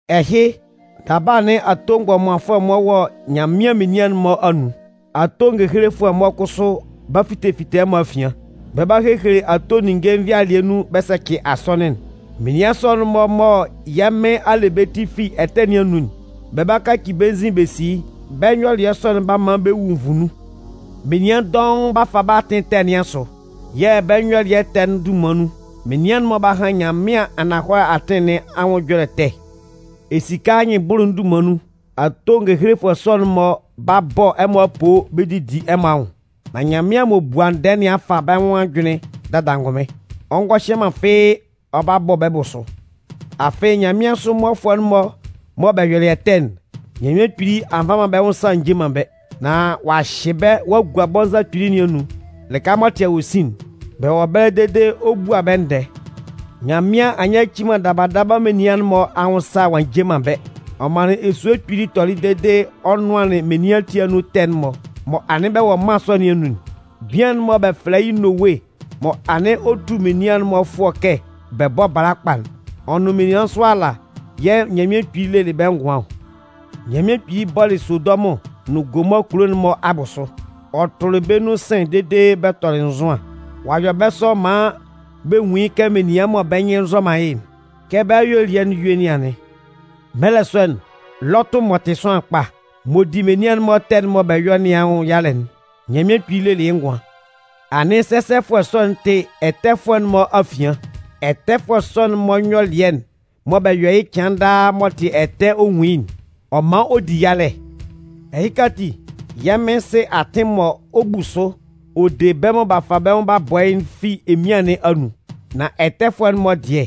Ɛhɩ, daba anɩn ato mgbɔmanfʋɛ-mɔ wɔ Nyanmɩan menian'n-mɔ anun. Ato ngehelefʋɛ-mɔ kʋsʋ 'ba fite fite ɛmɔ afian. Bɛ 'ba hehele ato ninnge nvɩalɩɛ nun bɛ sɛcɩ asɔnɩn'n. Menian sɔ'n-mɔ mɔ yɛ́ Mɩn a le bɛ́ ti fi bɛ́ ɛtɛ nɩn anun'n, b'a kaci bɛ́ nzin b'a si yɩ́. Bɛ́ nyɔlɩɛ sɔ'n 'ba man bɛ wu nvu nun. Menian dɔʋn 'ba fa bɛ́ atɩn ɛtɛ nɩn asʋ yɛ̂ bɛ́ nyɔlɩɛ ɛtɛ'n dunman nun, menian'n-mɔ 'ba han Nyanmɩan ananhɔlɛ atɩn nɩn anwʋn ɛjɔlɛ ɛtɛ. Esika anyɩnbʋlʋ'n dunman nun, ato ngehelefʋɛ sɔ'n-mɔ 'ba bɔ ɛmɔ apoo bɛ didi ɛmɔ anwʋn. Nan Nyanmɩan m'ɔ bua ndɛɛ nɩn a fa bɛ́ nwʋn ajʋnlɩn dada angʋnmɩn. Ɔ ngɔ hyɛ man fɩ́ɩ́ ɔ 'ba bɔ bɛ́ bʋsʋ. Afɩ nyanmɩansʋ mmɔfʋɛ'n-mɔ mɔ bɛ yɔlɩ ɛtɛ'n, Nyanmɩan Kpili a nva man bɛ́ nwʋn sa a nje man bɛ́. Nán ɔ'a hyɩ bɛ́ ɔ'a gua bɔnza kpili nɩn anun, lɩka m'ɔ tɩ awosin'n. Bɛ wɔ ɛbɛlɛ dede ɔ 'bua bɛ́ ndɛɛ. Nyanmɩan a nyaci man daba daba menian'n-mɔ anwʋn sa ɔ'a nje man bɛ́. Ɔ manlɩn esue kpili tɔlɩ dede ɔ nʋanlɩn menian ati anun ɛtɛ'n-mɔ mɔ anɩn bɛ wɔ mân sɔ nɩn anun'n. Bian'n mɔ bɛ fɛlɛ yɩ́ Nowe mɔ anɩn ɔ tu menian'n-mɔ fʋɔ kɛ bɛ bɔ́ bala kpa'n, ɔ nʋn menian nsʋ ala yɛ̂ Nyanmɩan Kpili lelɩ bɛ́ ngʋan ɔ. Nyanmɩan Kpili bɔlɩ Sodɔmʋn nʋn Gomɔɔ kulo'n-mɔ abʋsʋ. Ɔ tʋlɩ bɛ́ nun sɩ̂n dede bɛ tɔlɩ nzʋan. Ɔ'a yɔ bɛ́ sɔ maan bɛ nwun yɩ́ kɛ menian mɔ bɛ́ nyɩn nzɔ man yɩ́'n, kɛ bɛ́ ayuelɩɛ'n yue yɩ́ nɩn anɩn. Mɛlɛ sɔ'n, Lɔtʋ m'ɔ tɩ sʋanlan kpa, m'ɔ di menian'n-mɔ ɛtɛ'n mɔ bɛ yɔ nɩn anwʋn yalɛ'n, Nyanmɩan Kpili lelɩ yɩ́ ngʋan. Anɩn sɛsɛfʋɛ sɔ'n tɩ ɛtɛfʋɛ'n-mɔ afian. Ɛtɛfʋɛ sɔ'n-mɔ nyɔlɩɛ'n mɔ bɛ yɔ yɩ́ cɩan daa m'ɔ tɩ ɛtɛ ɔ nwun yɩ́'n, ɔ man ɔ di yalɛ. Ɛhɩka ati, yɛ́ Mɩn sɩ atɩn mɔ ɔ 'bu sʋ ɔ de bɛ́ mɔ b'a fa bɛ́ nwʋn b'a bɔ yɩ́'n fi emian nɩn anun. Nan ɛtɛfʋɛ'n-mɔ dɩɛ,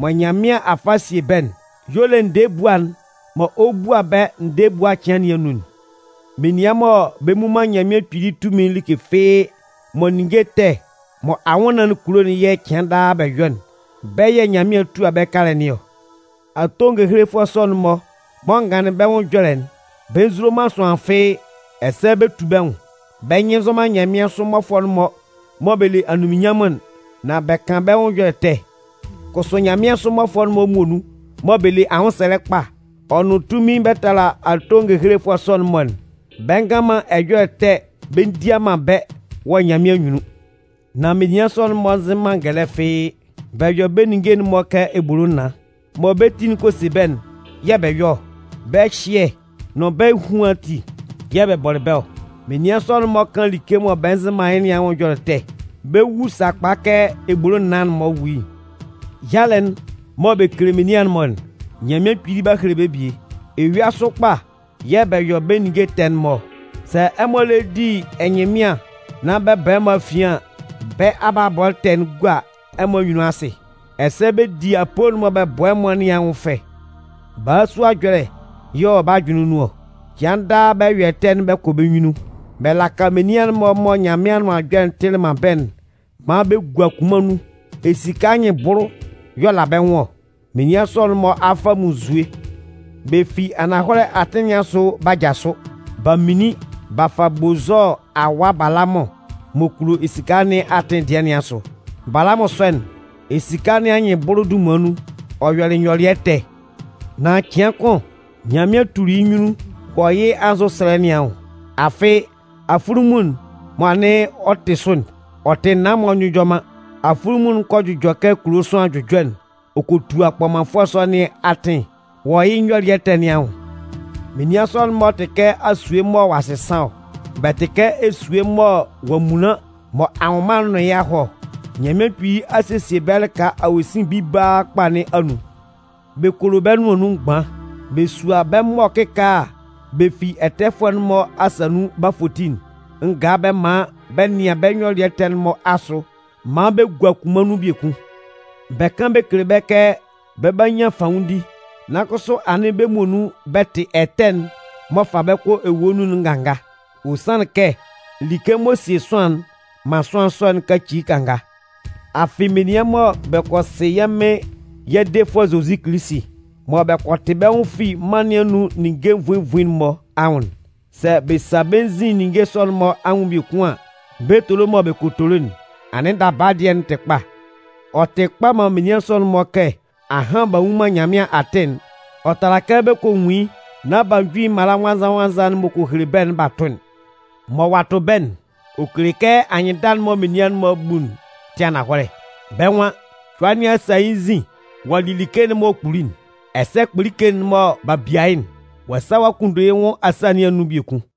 mɔ Nyanmɩan a fa a sie bɛ́'n y'ɔ le ndɛɛ ebua'n mɔ ɔ 'bua bɛ́ ndɛɛ ebua cɩan nɩn anun'n. Menian mɔ bɛ mmu man Nyanmɩan Kpili tunmin'n like fɩ́ɩ́ mɔ ninnge ɛtɛ mɔ anwʋnnaan'n kulo'n yɛ̂ cɩan daa bɛ yɔ'n, bɛ́ yɛ̂ Nyanmɩan 'tua bɛ́ kalɛ nɩn ɔ. Ato ngehelefʋɛ sɔ'n-mɔ mɔ n ganlɩn bɛ́ ɛjɔlɛ'n, bɛ nzulo man sʋanlan fɩ́ɩ́, ɛsɛ bɛ tu bɛ́ nwʋn. Bɛ́ nyɩn nzɔ man nyanmɩansʋ mmɔfʋɛ'n-mɔ mɔ bɛ le anunminnyanmʋn'n, nan bɛ kan bɛ́ nwʋn ɛjɔlɛ ɛtɛ. Kʋsʋ nyanmɩansʋ mmɔfʋɛ'n-mɔ muonun mɔ bɛ le anwʋnsɛlɛ kpa ɔ nʋn tunmin bɛ tala ato ngehelefʋɛ sɔ'n-mɔ'n, bɛ ngan man ɛjɔlɛ ɛtɛ bɛ ndia man bɛ́ wɔ Nyanmɩan anyunnun. Nan menian sɔ'n-mɔ nzɩ man ngɛlɛ fɩ́ɩ́. Bɛ yɔ bɛ́ ninnge'n-mɔ kɛ ebolo naan. Mɔ bɛ́ ti'n kɔ se bɛ́'n yɛ̂ bɛ yɔ ɔ. Bɛ́ ɛhyɩɛ nʋn bɛ́ ehuan ati yɛ̂ bɛ bɔlɩ bɛ́ ɔ. Menian sɔ'n-mɔ kan like mɔ bɛ nzɩ man yɩ́ nɩn anwʋn ɛjɔlɛ ɛtɛ. Bɛ 'wu sakpa kɛ ebolo naan'n-mɔ wu yɩ́'n. Yalɛ'n mɔ bɛ kele menian'n-mɔ'n, Nyanmɩan Kpili 'ba hele bɛ́ bie. Eyua sʋ kpa yɛ̂ bɛ yɔ bɛ́ ninnge ɛtɛ'n-mɔ ɔ. Sɛ ɛmɔ lɛ di ɛnyɩnmɩan nán bɛ ba ɛmɔ afian an, bɛ́ abalabɔ ɛtɛ'n gua ɛmɔ anyunnun asɩ. Ɛsɛ bɛ di apoo'n mɔ bɛ bɔ ɛmɔ nɩn anwʋn fɛ. Balasua ɛjɔlɛ yɛ̂ ɔ wɔ bɛ́ ajʋnlɩn nun ɔ. Cɩan daa bɛ yɔ ɛtɛ'n bɛ kɔ bɛ́ nyunnun. Bɛ laka menian'n-mɔ mɔ Nyanmɩan Anʋan Ɛjɔlɛ'n tɩlɩ man bɛ́'n maan bɛ gua kunman nun. Esika anyɩnbʋlʋ y'ɔ la bɛ́ nwʋn ɔ. Menian sɔ'n-mɔ a fa munnzue. Bɛ fi ananhɔlɛ atɩn nɩn asʋ b'a jasʋ. B'a minlin b'a fa Bozɔɔ awa Balamʋn m'ɔ kulo esika nɩn atɩn dɩɛ nɩn asʋ. Balamʋn sɔ'n, esika nɩn anyɩnbʋlʋ dunman nun, ɔ yɔlɩ nyɔlɩɛ ɛtɛ. Nan cɩan kʋn Nyanmɩan tuli yɩ́ nyunnun wɔ yɩ́ anzʋsɛlɛ nɩn anwʋn. Afɩ afunlunmun'n mɔ anɩn ɔ tɩ sʋ'n, ɔ tɩ naan m'ɔ njʋjɔ man. Afunlunmun'n kɔ jʋjɔ kɛ kulo sʋanlan jʋjɔ'n ɔ kɔ tua kpɔmanfʋɛ sɔ nɩn atɩn wɔ yɩ́ nyɔlɩɛ ɛtɛ nɩn anwʋn. Menian sɔ'n-mɔ tɩ kɛ asue mɔ ɔ'a sɩsan ɔ. Bɛ tɩ kɛ esue mɔ ɔ'a munlan mɔ anwʋnman'n nʋn yɩ́ a hɔ ɔ. Nyanmɩan Kpili a sesie bɛ́ lɩka awosin bibaa kpa nɩn anun. Bɛ kolo bɛ́ nʋan nun mgban. Bɛ sua bɛ́ mɔ kɩkaala bɛ fi ɛtɛfʋɛ'n-mɔ asa nun b'a foti'n ngaa bɛ man bɛ nɩan bɛ́ nyɔlɩɛ ɛtɛ'n-mɔ asʋ maan bɛ gua kunman nun biekun. Bɛ kan bɛ kele bɛ́ kɛ bɛ 'ba nyan fanwʋndi, nan kʋsʋ anɩn bɛ́ muonun bɛ tɩ ɛtɛ'n m'ɔ fa bɛ kɔ ewue nun'n nganga. Ɔ sanlɩn kɛ like m'ɔ sie sʋanlan'n man sʋanlan sɔ'n kaci yɩ́ kanga. Afɩ menian mɔ bɛ kɔ sɩ yɛ́ Mɩn yɛ́ Defʋɛ Zozi Kilisi, mɔ bɛ kɔ tɩ bɛ́ nwʋn fi mân nɩn anun ninnge nvuin nvuin'n-mɔ anwʋn'n, sɛ bɛ sa bɛ́ nzin ninnge sɔ'n-mɔ anwʋn biekun an, bɛ etolo mɔ bɛ kɔ tolo'n, anɩn daba dɩɛ'n tɩ kpa. Ɔ tɩ kpa man menian sɔ'n-mɔ kɛ ahan b'a nwun man Nyanmɩan atɩn'n, ɔ tala kɛ bɛ kɔ nwun yɩ́ nán b'a ju yɩ́ mala nwannzan-nwannzan'n m'ɔ kɔ hele bɛ́'n b'a tʋ'n. Mɔ ɔ'a tʋ bɛ́'n, ɔ kele kɛ anyɩnndala'n mɔ menian'n-mɔ bu'n tɩ ananhɔlɛ. Bɛ́ nwan: “Cʋa nɩn a sa yɩ́ nzin ɔ'a li like'n m'ɔ kpuli'n,” ɛsɛ “Kpolike'n mɔ b'a bia yɩ́'n, ɔ'a sa ɔ'a kunndo yɩ́ nwʋn asâ nɩn anun biekun.”